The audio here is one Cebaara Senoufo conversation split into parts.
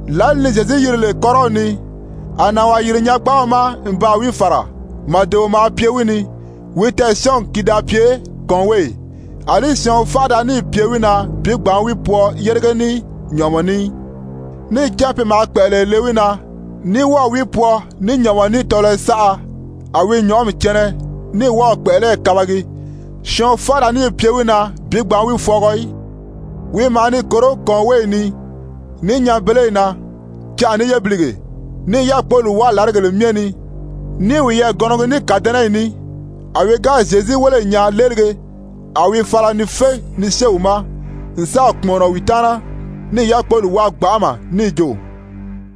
Lǎli ni Zyezu yiri lè kɔ́rɔw ni, a nànwaa yìri nyangbaaw ma n baa wi fàra, màdeo maa pye wi ni. Wi tɛɛ̀syɔɔngi ki da pye kɔ̀ɔnweeyi, àlí syɔɔn fánʔa da níì pye wi na bi gbǎn wi pwɔɔ yérige ní nyɔ̀ʔɔmɔ ní í. Níì cán pe maa kpɛ̀ʔɛlɛyɛ le wi na, ní wɔ́ɔ̀ wi pwɔɔ ní nyɔ̀ʔɔmɔ ní tɔlɔyɔ saʔa, a wi nyɔ̀ʔɔmi cɛnɛ ní wɔ́ɔ̀ kpɛ̀ʔɛlɛyi kabagi, syɔɔn fánʔa da níì pye wi na bi gbǎn wi fwɔɔgɔ í. Wi maa ni kòró kɔ̀ɔnweeyi ni, ní nyanbeleyi na canʔa ní yébilige, ní i yákpoli wáa làrigèle myɛ ni, ní i wiyɛɛ gɔnɔgi ní kàdɛnɛyi ní. A wi ga Zyezu wéle n nyaa léelige, a wi fala ni fé ni syée wi ma n sáà kpùmɔnɔ wi taana, níì yákpoli wáa gbanʔama níì jo: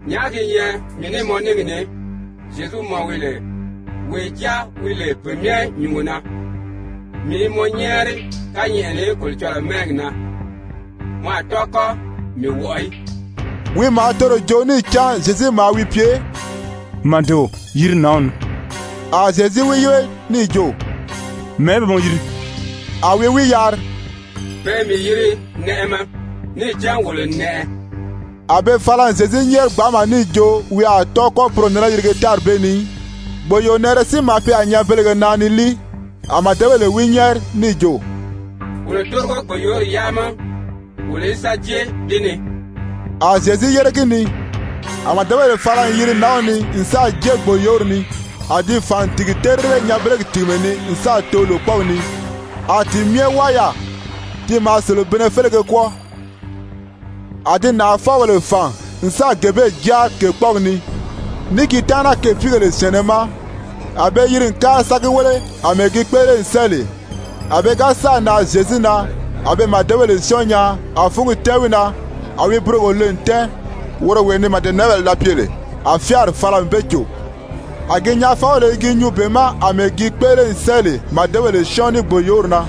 «Nyàʔá gi nyɛ mii ní mɔ níngi ní, Zyezu, mɔ wi lè wee Jáa wi lè Pe Myɛ Nyúngo na? Mii i mɔ nyɛ́ɛri kányɛʔɛ ni Kolocɔlɔɔ mɛ́ɛgi na, mɔ a tɔ́ɔ kɔ́ mii wɔʔɔ í.» Wi maa toro joo níì cán Zyezu maa wi pye: «Màdeo, yiri nǎnw ni.» A Zyezu wi yíbe níì jo: «Mɛ̀ɛ́ be mɔ yiri?» A wi wi yari: «Pe i mii yiri Nɛʔɛmɛ, níì cán wolo n nɛʔɛ.» A be fala n Zyezu nyɛ́ɛri gbanʔama níì jo wi a tɔ́ɔ kɔ́ poro nɛnɛ yirige tári bee ni í. Gbòyoonɛʔɛrɛ si maa pye yaà nyanbelege na ni líi, a màdebèle wi nyɛ́ɛri níì jo: «Wolo tórigo gbòyoori yaa ma wolo í sa jée di ni.» A Zyezu yére gi ni. A màdebèle fala n yiri nǎnw ni n sáà jée gbòyoori ni, a di fàn n tìgi terire nyanbelegi tìgimɛ ni n sáà too lòkpɔɔgi ni, a ti myɛ wáa yaà. Ti maa selebinnɛ félege kwɔ́ɔ. A di nàʔafɔbèle fàn n sáà gee bee jáari kèkpɔɔgi ni, ní gi taana kèpiigèle syɛ̀ɛnnɛ ma. A be yiri n kári sa gi wéle àmɛɛ gi kpéʔele n sɛ́ɛ lè. A pe ga sáà nan Zyezu na, a be màdebèle syɔ́ɔn nyaa a fúngi tɛ́ɛn wi na, a wi burogo le n tɛ́ɛn, woro wee ni màdenɛʔɛbèle da pye lè, a fyáari fala n be cò. A gi nyaafɔbèle i gi nyuu be ma àmɛɛ gi kpéʔele n sɛ́ɛ lè màdebèle syɔ́ɔn ní gbòyoori na.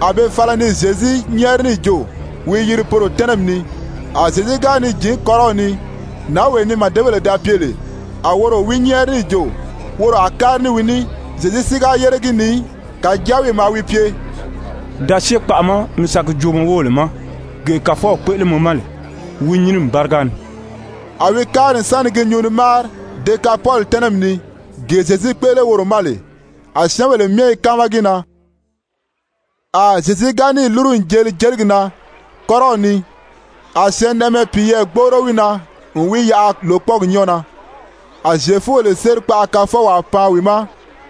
A be fala ni Zyezu nyɛ́ɛri níì jo wi yiri poro tɛ́nɛmi ni. A Zyezu ga ni jǐn kɔ́rɔw ni, nǎnwee ni màdebèle da pye lè, a woro wi nyɛ́ɛri níì jo woro a kári ní wi ní. Zyezu si ga yére gi ni í, kàjáa wi maa wi pye: «Da syée kpaʔa ma mi sa gi joo mɔ wóbèle ma gee Kàfɔw kpéʔele mɔ ma lè wi nyínimi báriga ni.» A wi kári n sa ni gi nyuu ni máari Dekapoli tɛ́nɛmi ni, gee Zyezu kpéʔele woro ma lè, a syɛ́ɛnbèle myɛ i káama gi na. A Zyezu ga níì lúru n jeli jeligi na kɔ́rɔw ni, a syɛɛnnɛʔɛmɛ piyɛɛ gbóʔoro wi na n wi yaʔa lòkpɔɔgi nyɔ́ɔ na. A Zyefubèle sérikpaʔa kafɔwaa pan wi ma,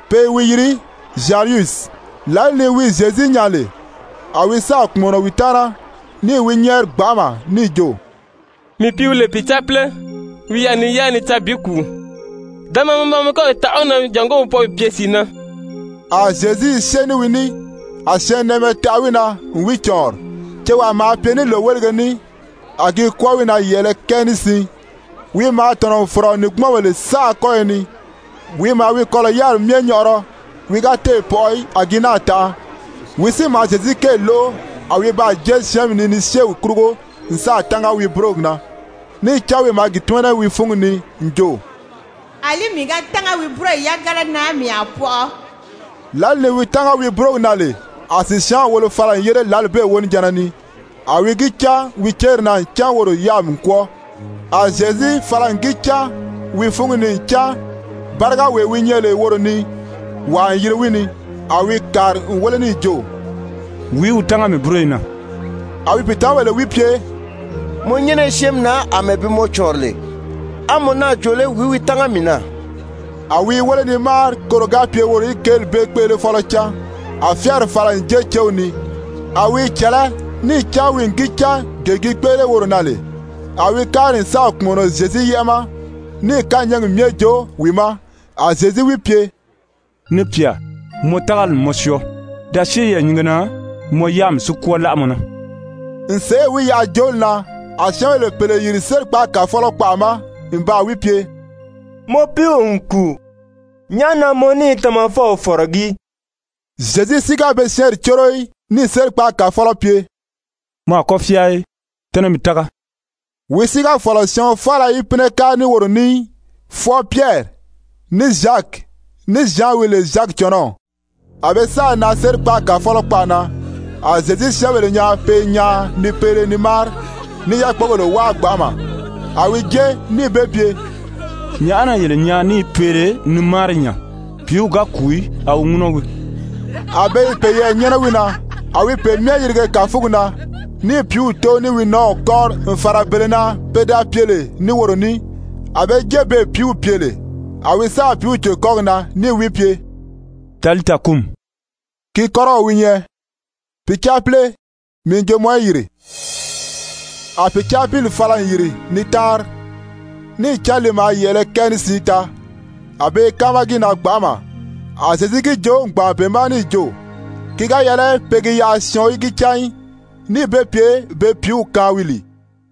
pe i wi yiri Zyayirusi. Lǎli ni wi Zyezu nyaa lè, a wi sáà kpùmɔnɔ wi taana, níì wi nyɛ́ɛri gbanʔama níì jo: «Mii pìíw wi lè pìcaapile, wi i yaà ni yáa ni caa bi kùu. Da maa mi ba kɔ́yi taʔa wi na jàngó wi pɔʔɔ bi pye sìi na.» A Zyezu i syée ní wi ní, a syɛɛnnɛʔɛmɛ taʔa wi na n wi cɔ̀ɔnri. Cewaa maa pye ní lòwelige ní, a gi kwɔ́ɔ wi na yɛ̀ʔɛlɛ kɛɛ ní siin. Wi maa tɔ̀nɔ n fɔ̀rɔ nìngbumɔnbèle saʔa kɔ́yɔ ni. Wi maa wi kɔlɔ̀ yáriri myɛ nyɔʔɔrɔ, wi ga téè pɔʔɔ í, a gi náà tanʔa. Wi si maa Zyezu kéeli lóʔo, a wi baa jée syɛ́ɛnmi ni ni syée wi kurugo n sáà tánga wi búrogi na. Níì cán wi maa gi tímana wi fúngi ni n jo: «Alí mii ga tánga wi búroyi yagana na mii a pɔʔɔ.» Lǎli ni wi tánga wi búrogi na lè, a sìsyaanw wolo fala n yére lǎli bee wonijanna ni, a wi gi cán wi céri na ncan woro yáami n kwɔ́ɔ. A Zyezu fala n gi cán wi fúngi ni ncan bárigawee wi nyɛ lè woro ni, wàa n yiri wi ni, a wi kàri n wéle níì jo: «Wìí wi tánga mii búroyi na?» A wi pìitamabèle wi pye: «Mɔ nyɛ́nɛ i syɛ́ɛnmi na àmɛɛ bi mɔ cɔ̀ɔnri lè, a mɔ náà jo lé: ‹Wìí wi tánga mii na?›» A wi i wéle ni máari koro ga pye woro í kéeli bee kpéʔelefɔlɔ cán. A fyáari fala n jée céw ni, a wi i cɛ̀lɛ́, níì cán wi n gi cán gee gi kpéʔele woro na lè, a wi kári n sáà kpùmɔnɔ Zyezu yɛ́ʔɛ ma, níì kányɛɛgi myɛ joo wi ma. A Zyezu wi pye: «Ni pyà, mɔ tágali n mɔ syɔɔ. Da syée yɛɛ̀nyinge na, mɔ yáami si kwɔ́ɔ láʔa mɔ na.» N sèʔê wi yaʔa jooli na, a syɛ́ɛnbèle pèle yìri sérikpaagi kàfɔlɔ kpaʔa ma n baa wi pye: «Mɔ piiw n kùu, nyàʔá na mɔ ní i Tamafɔw fɔ̀rɔgí?» Zyezu si ga be syɛ́ɛnri córo í, níì sérikpaagi kàfɔlɔ pye: «Mɔ a kɔ́ fyáa í, tɛ́nɛ mi tága.» Wi si ga fɔ̀lɔ syɔɔn faala í pínɛ kári ní woro ní í, fwɔɔ Pyɛri, ní Zyaki, ní Zyan wi lè Zyaki cɔnɔw. A be sáà nan sérikpaagi kàfɔlɔ kpaʔa na, a Zyezu syɛ́ɛnbèle nyaa pe i nyaan ni peele ni máari ní i yákpogèle wáa gbanʔama. A wi jée níì be pye: «Nyàʔá na yele nyaan ní i peele ni máari nya? Pìíw ga kùu í, a wi ŋúnɔ wii.» A be i peyɛɛ nyɛ́nɛ wi na. A wi pe myɛ yirige kàfugi na níì pìíw tóo ní wi nɔ́ɔw kɔ́ri n fàra bele na pe da pye lè ní woro ní, a be jée beè pìíw pye lè. A wi sáà pìíw cò kɔ́gi na níì wi pye: «Talita kumi,» ki kɔ́rɔw wi nyɛ: «Pìcaapile, mii n jo mɔ í yìri.» A pìcaapili fala n yìri ni táanri. Níì cán li maa yɛ̀ʔɛlɛ kɛɛ ní siin taa. A be i káama gi na gbanʔama. A Zyezu gi joo n gbàn be ma níì jo ki ga yɛlɛ pe gi yaʔa syɔɔn í gi cán í, níì be pye be pìíw kaan wi lìi.